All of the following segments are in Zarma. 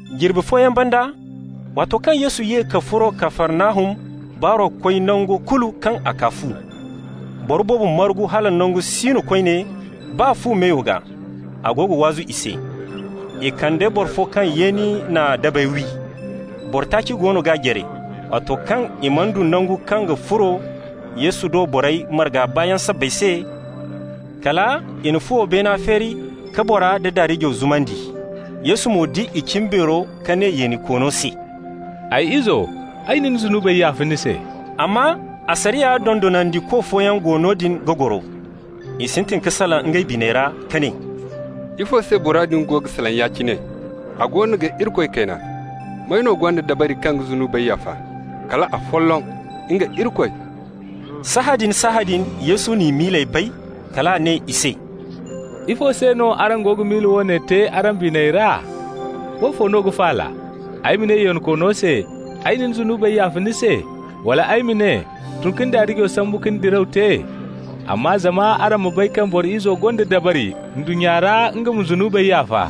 Jirbi fooyaŋ banda, waato kaŋ Yesu ye ka furo Kafarnahum, baaro koy nangu kulu kaŋ a kaa fu. Boro boobo margu hala nangu si no koyne, baa fu meyo gaa. A go ga waazu i se. I kande boro fo kaŋ yeeni na dabey wi. Boro taaci goono g'a jare. Waato kaŋ i mana du nangu kaŋ ga furo Yesu do borey marga baayaŋ sabbay se, kala i na fuwo beena feeri ka bora da daarijo zumandi. Yesu mo di i cimbeero ka ne yeenikoono se: «Ay izo, ay na ni zunubey yaafa ni se.» Amma asariya dondonandiko fooyaŋ go noodin ga goro. I sintin ka salaŋ ngey biney ra ka ne: «Ifo se bora din go ga salaŋ ya-cine? A goono ga Irikoy kayna. May no gonda dabari kaŋ ga zunubey yaafa, kala afolloŋ, nga Irikoy?» Sahãadin-sahãadin Yesu n'i miiley bay. Kal a ne i se: «Ifo se no araŋ go ga miila woone te araŋ biney ra? Woofo no ga faala, ay ma ne yeenikoono se: ‹Ay na ni zunubey yaafa ni se?› wala ay ma ne: ‹Tun ka ni daarijo sambu ka ni diraw te?› Amma zama araŋ ma bay kaŋ Boro Izo gonda dabari ndunnya ra nga ma zunubey yaafa,»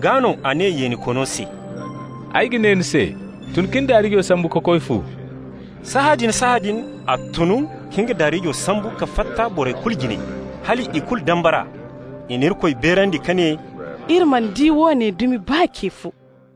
(gaa no a ne yeenikoono se:) «Ay ga ne ni se: tun ka ni daarijo sambu ka koy fu.» Sahãadin-sahãadin a tun ka nga daarijo sambu ka fatta borey kulu jine. Hal i kulu dambara. I na Irikoy beerandi ka ne: «Iri mana di woone dumi, baa ce fo.»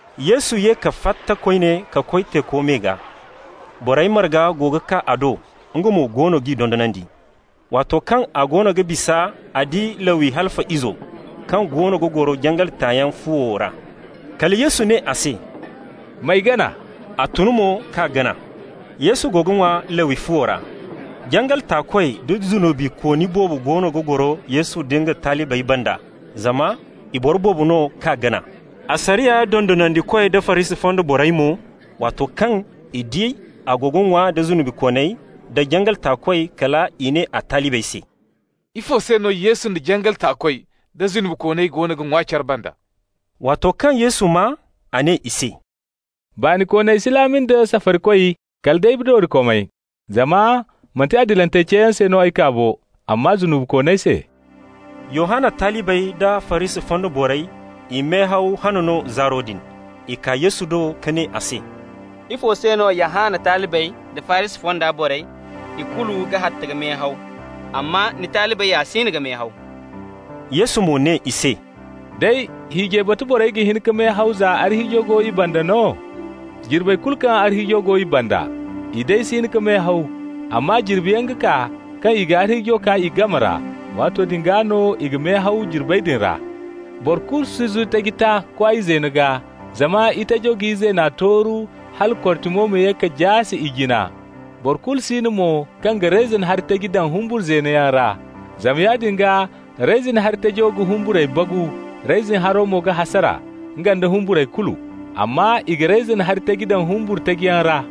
Yesu ye ka fatta koyne ka koy teeko me gaa. Borey marga go ga kaa a do, nga mo goono g'i dondonandi. Waato kaŋ a goono ga bisa a di Lawi, Halfa izo, kaŋ goono ga goro jangal taayaŋ fuwo ra. Kala Yesu ne a se: «M'ay gana.» A tun mo k'a gana. Yesu go ga ŋwa Lawi fuwo ra. Jangal taakoy da zunubikooni boobo goono ga goro Yesu nda nga talibey banda, zama i boro boobo no k'a gana. Asariya dondonandikoy da Farisi fonda borey mo, waato kaŋ i di a go ga ŋwa nda zunubikooney nda jangal taakoy, kal i ne a talibey se: «Ifo se no Yesu da jangal taakoy, da zunubikooney goono ga ŋwa care banda?» Waato kaŋ Yesu maa, a ne i se: «Baanikooney si laami nda safarikoy, kala day doorikomey. Zama manti adilantey ceeyaŋ se no ay kaa bo, amma zunubikooney se.» Yohanna talibey da Farisi fonda borey, i mehaw han no zaaro din. I kaa Yesu do ka ne a se: «Ifo se no Yohanna talibey da Farisi fonda borey, i kulu ga hatta ka mehaw, amma ni talibey ya siino ga mehaw?» Yesu mo ne i se: «Day hiijay batu borey ga hin ka mehaw za arhiijo go i banda no? Jirbey kulu kaŋ arhiijo go i banda, i day si hin ka mehaw. Amma jirbiyaŋ ga kaa, kaŋ i ga arhiijo kaa i game ra. Waato din gaa no i ga mehaw, jirbey din ra. Boro kulu si zu taji ta kwaay zeeno gaa, zama itajo ga izeena tooru hala kortimo ma ye ka jaase ijina. Boro kulu si no mo kaŋ ga reyzin hari taji daŋ humbur zeeno yaŋ ra. Zama yaadin gaa reyzin hari tajo ga humburey bagu. Reyzin haro mo ga hasara, nga nda humburey kulu. Amma i ga reyzin hari taji daŋ humbur taji yaŋ ra.»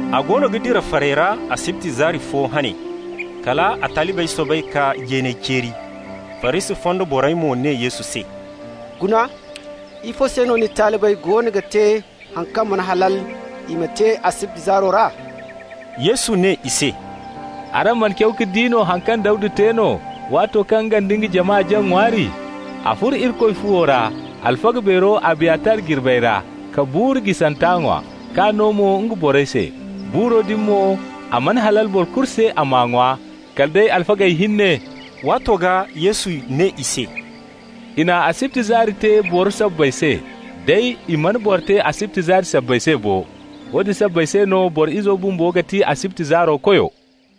A goono ga dira farey ra asibti zaari fo hane. Kal a talibey soobay ka jeeney ceeri. Farisi fonda borey mo ne Yesu se: «Guna, ifo se no ni talibey goono ga te haŋ kaŋ mana halal i ma te asibti zaari ra?» Yesu ne i se: «Araŋ mana caw ka di haŋ kaŋ Dawda te no waato kaŋ nga nda nga jama jaŋ ŋwaari? A furo Irikoy fuwo ra, alfaga beero Abiyatar jirbey ra, ka buuru jisanta ŋwa, k'a no mo nga borey se. Buuro din mo, a mana halal boro kulu se a m'a ŋwa, kala day alfagey hinne.» Waato gaa Yesu ne i se: «I na asibti zaari te boro sabbay se, day i mana boro te asibti zaari sabbay se bo. Woodin sabbay se no Boro Izo bumbo ga ti asibti zaaro Koyo.»